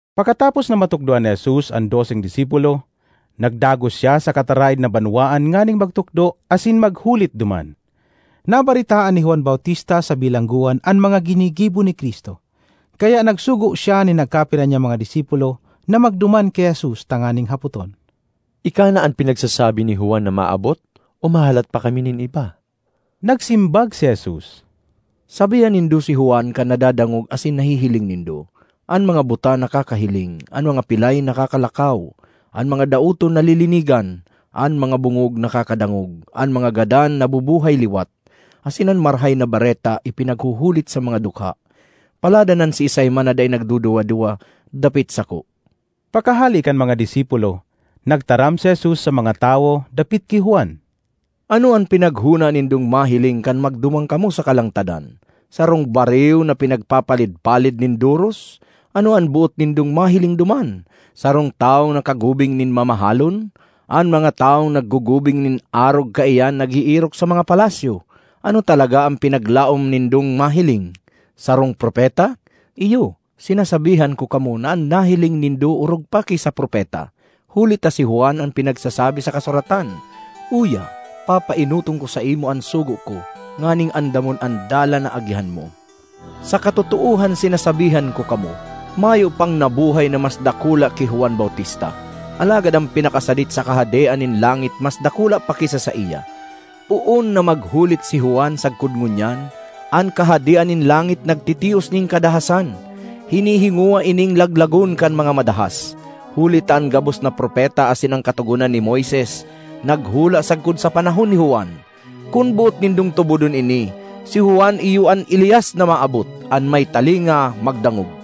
Pakatapos na matukdoan ni Jesus an doseng disipulo, nagdagos siya sa kataraed na banwaan nganing magtukdo asin maghulit duman. Nabaretaan ni Juan Bautista sa bilanggoan an mga ginigibo ni Cristo, kaya nagsugo siya nin nagkapira niyang mga disipulo na magduman ki Jesus, tanganing hapoton, “Ika na an pinagsasabi ni Juan na maabot, o mahalat pa kami nin iba?” Nagsimbag si Jesus, “Sabihan nindo si Juan kan nadadangog asin nahihiling nindo: an mga buta nakakahiling, an mga pilay nakakalakaw, an mga daoton nalilinigan, an mga bongog nakakadangog, an mga gadan nabubuhay liwat, asin an Marahay na Bareta ipinaghuhulit sa mga dukha. Paladan an siisay man na dai nagduduwa-duwa dapit sako!” Pakahale kan mga disipulo, nagtaram si Jesus sa mga tawo dapit ki Juan, “Ano an pinaghona nindong mahiling kan magduman kamo sa kalangtadan? Sarong bariw na pinagpapalid-palid nin doros? Ano an boot nindong mahiling duman? Sarong tawong nakagubing nin mamahalon? An mga tawong naggugubing nin arog kaiyan nag-eerok sa mga palasyo! Ano talaga an pinaglaom nindong mahiling? Sarong propeta? Iyo, sinasabihan ko kamo na an nahiling nindo orog pa ki sa propeta. Huli ta si Juan an pinagsasabi sa kasuratan: ‘Uya, papaenoton ko saimo an sugo ko, nganing andamon an dalan na agihan mo.’ Sa katotoohan sinasabihan ko kamo, mayo pang nabuhay na mas dakula ki Juan Bautista; alagad an pinakasadit sa Kahadean nin langit mas dakula pa ki sa saiya. Poon na maghulit si Juan sagkod ngunyan, an Kahadean nin langit nagtitios nin kadahasan; hinihingowa ining laglagon kan mga madahas; huli ta an gabos na propeta asin an Katogonan ni Moises naghula sagkod sa panahon ni Juan. Kun boot nindong tubodon ini, si Juan iyo an Elias na maabot. An may talinga, magdangog!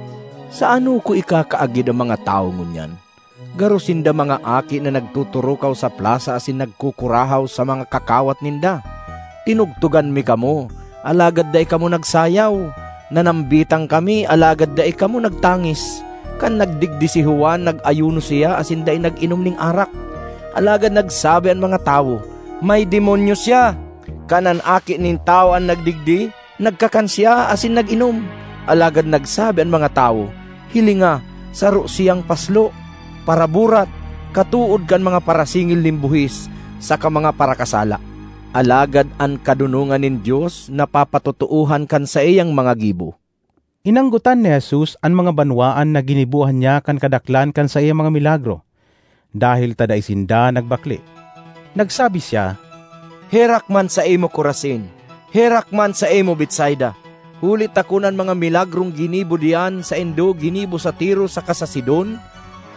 ”Sa ano ko ikakaagid an mga tawo ngunyan? Garo sinda mga aki na nagtuturukaw sa plasa asin nagkukurahaw sa mga kakawat ninda, ‘Tinugtogan mi kamo, alagad dai kamo nagsayaw! Nanambitan kami alagad dai kamo nagtangis!’ Kan nagdigdi si Juan, nag-ayuno siya asin dai nag-inom nin arak, alagad nagsabi an mga tawo, ‘May demonyo siya!’ Kan an Aki nin Tawo an nagdigdi, nagkakan siya asin nag-inom, alagad nagsabi an mga tawo, ‘Hilinga saro siyang paslo, paraburat, katood kan mga parasingil nin buhis saka mga parakasala!’ Alagad an kadonongan nin Dios napapatotoohan kan saiyang mga gibo.” Inanggotan ni Jesus an mga banwaan na ginibohan niya kan kadaklan kan saiyang mga milagro, dahel ta dai sinda nagbakle. Nagsabi siya, “Herak man saimo, Corazin! Herak man saimo, Betsaida! Huli ta kun an mga milagrong ginibo diyan saindo ginibo sa Tiro saka sa Sidon,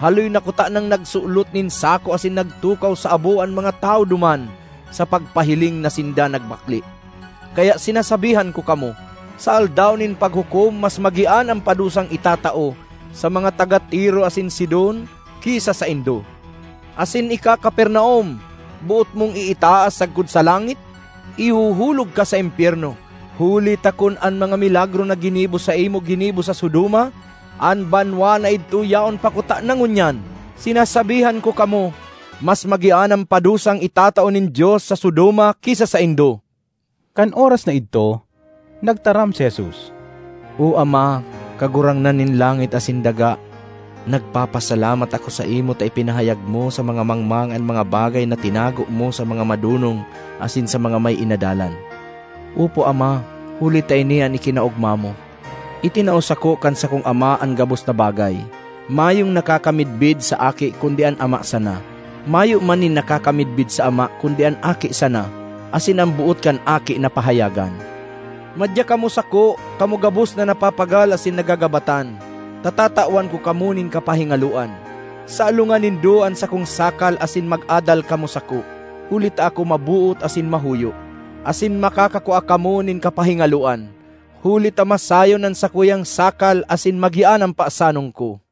haloy na kutanang nagsulot nin sako asin nagtukaw sa abo an mga tawo duman sa pagpahiling na sinda nagbakle. Kaya sinasabihan ko kamo, sa Aldaw nin Paghukom mas magian an padusang itatao sa mga taga Tiro asin Sidon ki sa saindo! Asin ika, Capernaum! Boot mong iitaas sagkod sa langit? Ihuhulog ka sa impyerno! Huli ta kun an mga milagro na ginibo saimo ginibo sa Sodoma, an banwaan na idto yaon pa kutana ngunyan! Sinasabihan ko kamo, mas magian an padusang itatao nin Dios sa Sodoma ki sa saindo.” Kan oras na idto, nagtaram si Jesus, “O Ama, Kagurangnan nin langit asin daga! Nagpapasalamat ako saimo ta ipinahayag mo sa mga mangmang an mga bagay na tinago mo sa mga madonong asin sa mga may inadalan. Opo, Ama, huli ta ini an ikinaogma mo. ”Itinao sako kan sakong Ama an gabos na bagay. Mayong nakakamidbid sa Aki kundi an Ama sana; mayo man nin nakakamidbid sa Ama kundi an Aki sana, asin an boot kan Aki na pahayagan. ”Madya kamo sako, kamo gabos na napapagal asin nagagabatan, ta tatawan ko kamo nin kapahingaloan. Salongan nindo an sakong sakal asin mag-adal kamo sako, huli ta ako maboot asin mahuyo; asin makakakua kamo nin kapahingaloan. Huli ta masayon an sakuyang sakal asin magian an pasanon ko.”